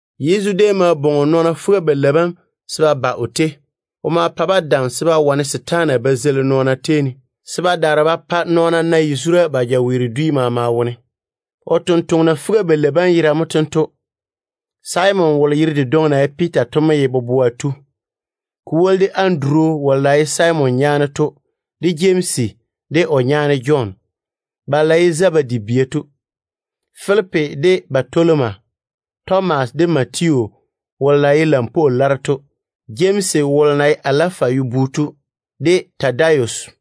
Yezu déem ma bwoŋi o nɔɔna fuga-balei bam se ba ba o tei. O ma pa-ba dam se ba wane setaana ba zeili nɔɔna tei ne, se ba daare ba pa nɔɔna na yazura ba jaweero dwi maama wone. O totoŋa nakwa fuga-balei bam yera mo tento: Simon wolo yere dedwoŋi na ye Piita to mo ye boboa tu. Ko woli de Anduru wolo na ye Simon nyaane to, de Jemsi, de o nyaane Jɔn, balo na ye Zebedi bia to. Filipi de Batoloma. Tomas de Matiyu wolo na ye lampwoo laro to. Jemsi wolo na ye Alafayu bu to, de Tadayus.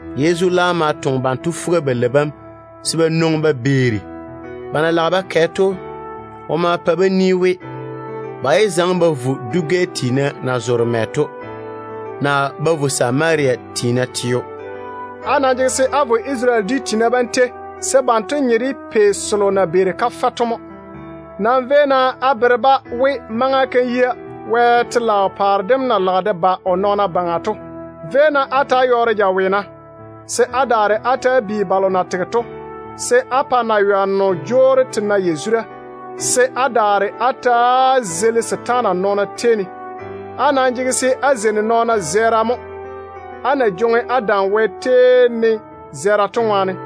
Yezu laam ma toŋe banto fuga-balei bam se ba nwoŋi ba beeri. Ba na lage ba kɛ konto to, o ma kaane-ba we, ba yé zaŋe ba vo dwi-gɛ tiina na zoore mɛ to, naa ba vo Samaria tiina teo. O maa we, “Á nam jege se á vo Isarele dwi tiina bam tei, se banto nye de pei selo na beeri kafɛ to mo. Nam véi-na á bere-ba we maŋa kam yia Wɛ telaao paare dem na lage de ba o nɔɔna baŋa to. Véi-na á ta‑á yɔɔre jaweena, se á daare á ta‑á bi balo na tege to, se á pa naywanno jwoori te na yazura, se á daare á ta‑á zeili setaana nɔɔna tei ne. Á nam jege se á zeini nɔɔna zɛɛra mo, á na jwoŋi á dam Wɛ tei ne zɛɛra to ŋwaane.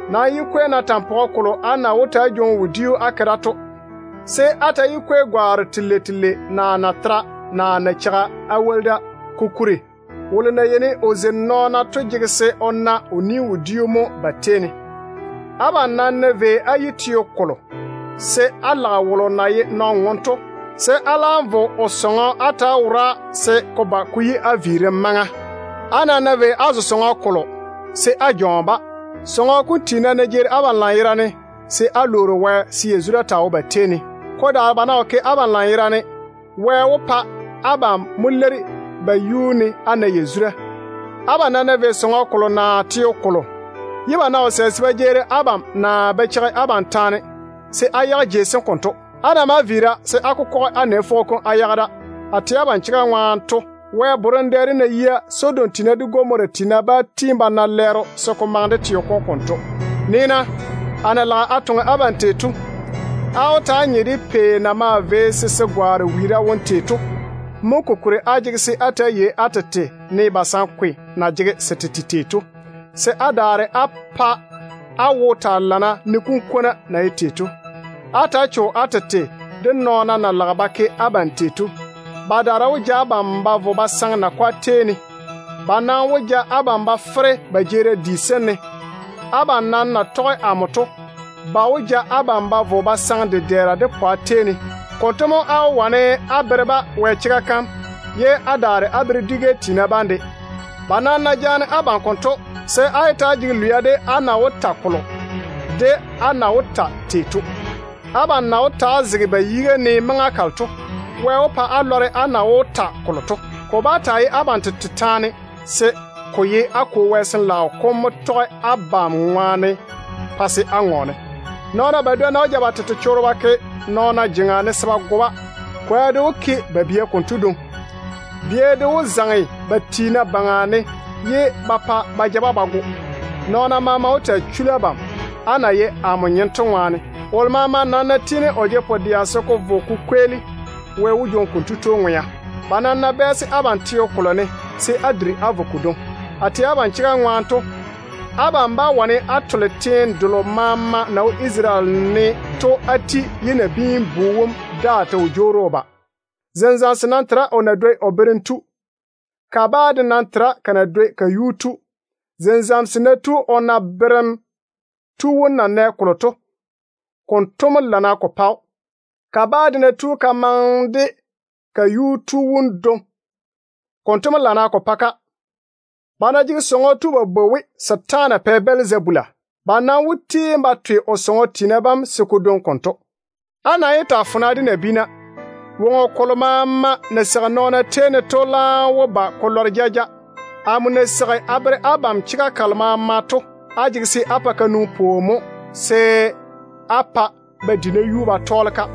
Nam yé kwei-na tampɔgɔ kolo á na wó ta‑á jwoŋi wodiu á ke da to. Á nam yé kwei gwaaro telei telei, naa natera, naa nacheiga á woli da. Kokuri, tontoŋeno maŋe se o taa jwoŋi o ni-wodiu mo. Abam nam ná vei á yi teo kolo, se á lage wolo na ye nɔn-ŋom to, se á laam vo o sɔŋɔ á ta‑á wora se ko ba ko yi á viirim. Á nam ná vei á zo sɔŋɔ kolo, se á jɔɔne-ba. Sɔŋɔ kom tiina nam ná jeeri abam lanyerane, se á lwoori Wɛ se yazura taa wo ba tei ne. Ko daare, ba ná wo ke abam lanyerane, Wɛ wó pa abam mo leiri ba yuu ne á na yazura. Abam nam ná vei sɔŋɔ kolo naa teo kolo, ye ba ná wo sɛ se ba jeeri abam naa ba cheigi abam taane, se á yage jei sem konto. Á ná maa viira, se á kokɔge á nɛ fwogo kom á yage da. A tɛ abam chega ŋwaane to, Wɛ borem dɛ dem ná yia, Sodom de Gomora tiina bá tiini ba na lɛɛro se ko maŋe de teo kom konto. Nii-na, a na lage a toŋe abam tei to, á wó ta‑á nye de pei na maa vei se se gwaane wiira wone tei to mo. Mo kokuri á jege se á ta‑á yei á tete ne basankwe na jege se tete tei to, se á daare á pa á wo taa lana ne kunkwona na ye tei to. Ta‑á cho-na á tete de nɔɔna na lage ba ke abam tei to. Badaara wó ja abam ba vo ba saŋe nakwa tei ne, ye ba daare ba ja abam ba fere ba jeerim di sem wone. Abam na tɔge amo to ŋwaane, ba wó ja abam ba vo ba saŋe dedɛɛra de pwa tei ne. Konto mo á wó wane á bere-ba Wɛ chega kam, ye á daare á bere dwi-gɛ tiina de. Ba nam ná jaane abam konto, se á yé ta‑á jege lwia de á na wó ta kolo, naa á na wó leiri-ba tei to. Abam na wó ta‑á zege ba yiga ne maŋa kalo to, Wɛ wó pa á lɔre á na wó ta kolo to. Ko bá taa ye abam tete taane, se ko ye á Kwo Wɛ Sin-laao kom mo wó tɔge abam baŋa pa se á ŋɔɔne. Nɔɔna badwonna wó ja ba tete chorro ba ke nɔɔna jeŋa ne se ba go-ba. Kwoa de wó ke ba bia konto dwoŋi. Bia de wó zaŋe ba tiina baŋa ne ye ba pa ba ja-ba ba go. Nɔɔna maama wó taa chuli abam, á na ye amo nyem to ŋwaane. Wolo maama nam ná tiini o jege pu-dɛa se ko vo ko kweeli, Wɛ wó jwoŋi konto tu ŋwea. Ba nam ná bɛɛse abam teo kolo ne, se á duri á vo kodwoŋi. A tɛ abam chega ŋwaane to, abam bá wane á tole teene delo maama na wo Isarele ne to á ti ye amo Nabiin-bu wom daa ta wo jwoori a ba. Zenzamso nam tera o na dwoi o berem tu. Kabaa de nam tera ka na dwoi ka tu. Zenzamso nam ná tu o yi ne o berem tu wom tei, konto mo lana ko pa‑o. Kabaa de ná tu ka yi ne o tu wom tei, konto mo lana ko pa‑o. Ba ná jege sɔŋɔ tu ba bwoi we, ‘Setaana pɛ Bɛlzabula’, ba nam wó tiini ba twe o sɔŋɔ tiina bam se ko dwoni konto. Á nam yé ta‑á fona de nabiina. Woŋo kolo maama na seigi nɔɔna tei ne to laam wó ba ko lɔre jaja. Amo na seigi a bere abam chega kalo maama to, á jege se á pa ka nwoŋi pwooni mo se á pa ba di nayuu ba tɔɔle-ka.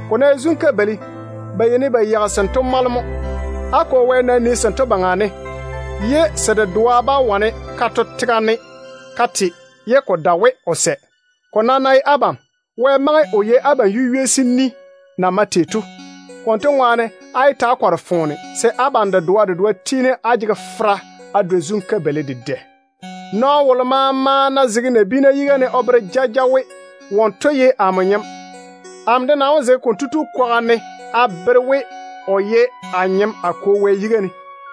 Ko ná ye zun-kabeili, ba yeini ba yeigi sento mɔle mo. Á Kwo Wɛ nam nii sento baŋa ne, ye se dedoa bá wane ka to tega ne ka te ye o wo sɛ. Ko nam ná ye abam, Wɛ maŋe o yei abam yu-ywei sem ni na mae tei to. Konto ŋwaane, á yé ta‑á kɔre foone, se abam dedoa dedoa tiini á jege fera á dwoi zun-kabeili dedɛ. Nɔɔno wolo maama ná zege nabiina yiga ne o bere jaja we wonto ye amo nyem, amo de nam wó zege konto tu kwaga ne a bere we o ye a nyem a Kwo Wɛ yiga ne.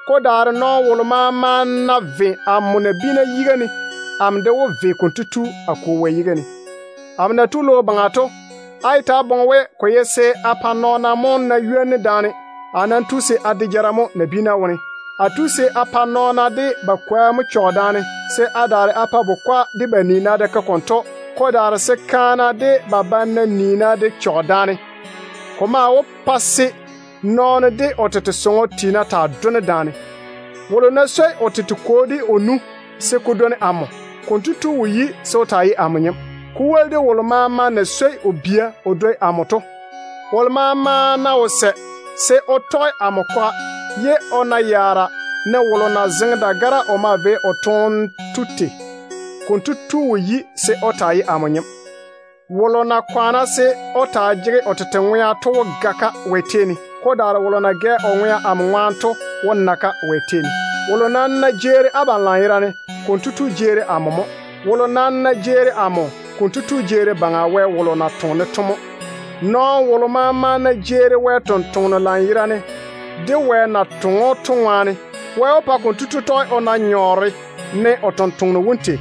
Ko daare nɔɔno wolo maama ná ve amo nabiina yiga ne, amo de wó ve konto tu a Kwo Wɛ yiga ne. Amo na tu logo baŋa to, á yé ta‑á boŋe we ko ye se a pa nɔɔna mo na ywoni daane. A nam tu se a de jara mo nabiina tetare ne. A tu se a pa nɔɔna de ba kwoa mo chɔge daane, se a daare a pa bukwa de ba niina de ke konto, se kaana de ba banna niina de chɔge daane. Ko maa wó pa se nɔɔno de o tete sɔŋɔ tiina taa done daane. Wolo ná swoi o tete kwo de o nu se ko dwoni amo, konto tu wo yi se o taa ye amo nyem, ko woli de wolo maama na swoi o bia o dwoi amo to. Wolo maama ná wo sɛ se o tɔge amo kwaga se o na yaara ne wolo na zeŋe dagara o maa vei o toone tei to, konto tu wo yi se o taa ye amo nyem. Wolo nam na kwaane se o taa jege o tete ŋwea to wó ga-ka Wɛ tei ne. Ko daare wolo na gɛ o ŋwea amo ŋwaane to wó na ŋwea Wɛ tei ne. Wolo nam ná jeeri abam lanyerane, konto tu jeeri amo mo. Wolo maa ná jeeri amo, konto tu jeeri Baŋa Wɛ wolo na toŋe-ne to mo. Nɔɔno wolo maama ná jeeri Wɛ ni-jwoŋinu lanyerane, de Wɛ na toŋe‑o to ŋwaane, Wɛ wó pa konto tu de tɔge o na nyɔɔre ne o ni-jwoŋinu wom tei.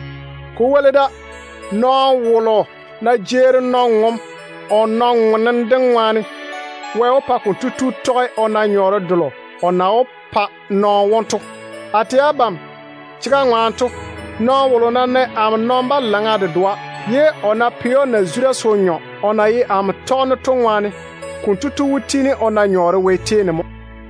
Ko woli da, nɔɔno wolo ná jeeri nɔn-ŋom o nɔn-ŋonne dem ŋwaane, Wɛ wó pa konto tu tɔge o na nyɔɔre delo o na wó pa nɔn-ŋom wom to. A tɛ abam chega ŋwaane to, nɔɔno wolo ná nɛ amo nɔn-balaŋa dedoa, ye o ná pɛ‑o na-zura se o nyɔ o na ye amo tɔgeno to ŋwaane, konto tu wó tiini o na nyɔɔre Wɛ tei ne mo.”